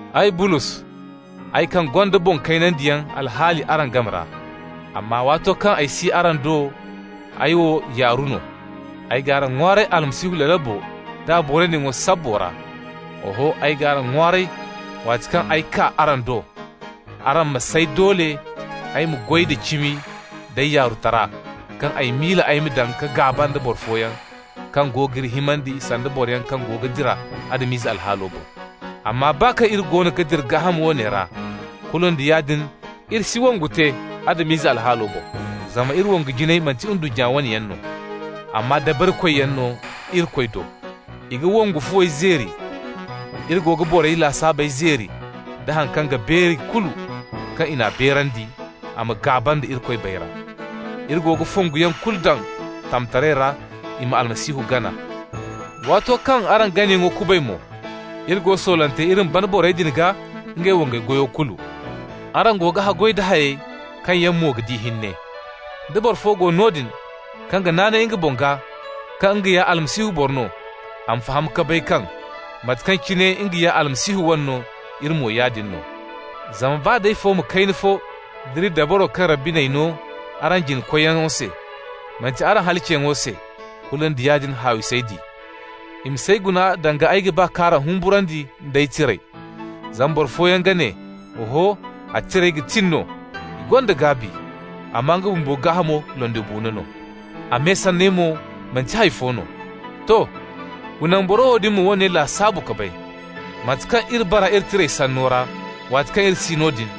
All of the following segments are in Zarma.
Ay, Bulos (ay kaŋ gonda «boŋ kaynandiyaŋ» alhaali araŋ game ra, amma waato kaŋ ay si araŋ do ay wo «yaaru» no) ay g'araŋ ŋwaaray Almasihu lalabo nd'a booriyaŋo sabbo ra. Oho, ay g'araŋ ŋwaaray, waati kaŋ ay kaa araŋ do araŋ ma s'ay doole ay ma goy da cimi nd'ay yaarutara kaŋ ay miila ay ma daŋ ka gaaba nda boro fooyaŋ kaŋ go g'iri himandi sanda boroyaŋ kaŋ go ga dira Adam-ize alhaalo boŋ. Amma baa kaŋ iri goono ga dira gaaham woone ra, kulu nda yaadin iri si wongu te Adam-ize alhaalo boŋ. Zama iri wongu jinayey manti ndunnya wo wane yaŋ no, amma dabarikoyyaŋ no Irikoy do. I ga wongu fuwey zeeri. Iri go ga borey lasaabey zeeri, da haŋ kaŋ ga beeri kulu kaŋ i n'a beerandi a ma gaaba nda Irikoy bayra. Iri go ga fonguyaŋ kulu daŋ tamtaray ra i ma Almasihu gana. Waato kaŋ araŋ ganayaŋo kubay mo, iri go soolante iri ma bana borey din gaa ngey wangay goyo kulu. Araŋ go ga haggoy da hayey kaŋ yaŋ mo ga di hinne. Da boro fo go noodin kaŋ ga naanay nga boŋ gaa kaŋ nga ya Almasihu boro no, a ma faham ka bay kaŋ, mate kaŋ cine nga ya Almasihu wane no, iri mo yaadin no. Zama baa d'ay fooma kayna fo nd'iri dabaro kaŋ Rabbi n'ay no araŋ jina-koyyaŋo se, manti araŋ halaciyaŋo se, kulu nda yaadin haawi s'ay di. I ma s'ay guna danga ay ga ba k'araŋ humburandi nd'ay tirey. Zama boro fooyaŋ ga ne: «Oho, a tirey ga tin no, i gonda gaabi. Amma nga bumbo gaahamo, londibuuno no. A me sanney mo manti hay fo no.» To. Wa naŋ boro wo dumi ma woone lasaabu ka bay: mate kaŋ iri bara iri tirey sanno ra waati kaŋ iri si noodin,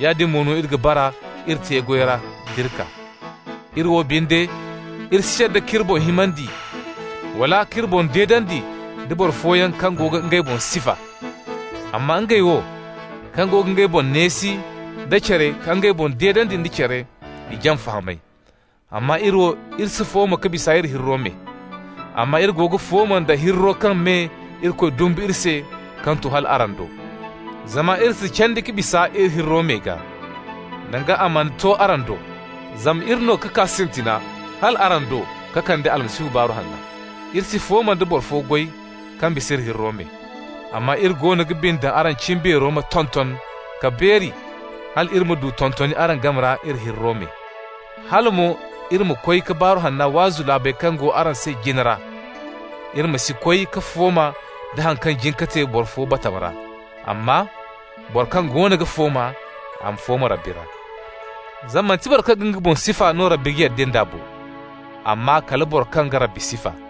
yaadin mo no iri ga bara iri te-goyey ra d'iri kaa. Iri wo binde, iri si yadda k'iri boŋ himandi wala k'iri boŋ deedandi nda boro fooyaŋ kaŋ yaŋ go ga ngey boŋ sifa. Amma ngey wo, kaŋ go ga ngey boŋ neesi nda care ka ngey boŋ deedandi nda care, i jaŋ fahamay. Amma iri wo, iri si fooma ka bisa iri hirro me. Amma iri ga fooma nda hirro kaŋ me Irikoy dumbu iri se kaŋ to hal araŋ do. Zama iri si candi ka bisa iri hirro meyo gaa, danga a mana to araŋ do, zama iri no ka kaa sintina hal araŋ do ka kande Almasihu Baaru Hanna. Iri si fooma nda boro fo goy kaŋ bisa iri hirro me. Amma iri goono ga bine daŋ araŋ cimbeero ma tonton ka beeri hal iri ma du tontoni araŋ game ra iri hirro me. Hala mo iri ma koy ka Baaru Hanna waazu laabey kaŋ go araŋ se jina ra. Iri ma si koy ka fooma nda haŋ kaŋ jin ka te boro fo batama ra. Amma: «Boro kaŋ goono ga fooma ma fooma Rabbi ra.» Zama manti boro kaŋ ga nga boŋ sifa no Rabbi ga yadda nd'a bo, amma kala boro kaŋ Rabbi ga sifa.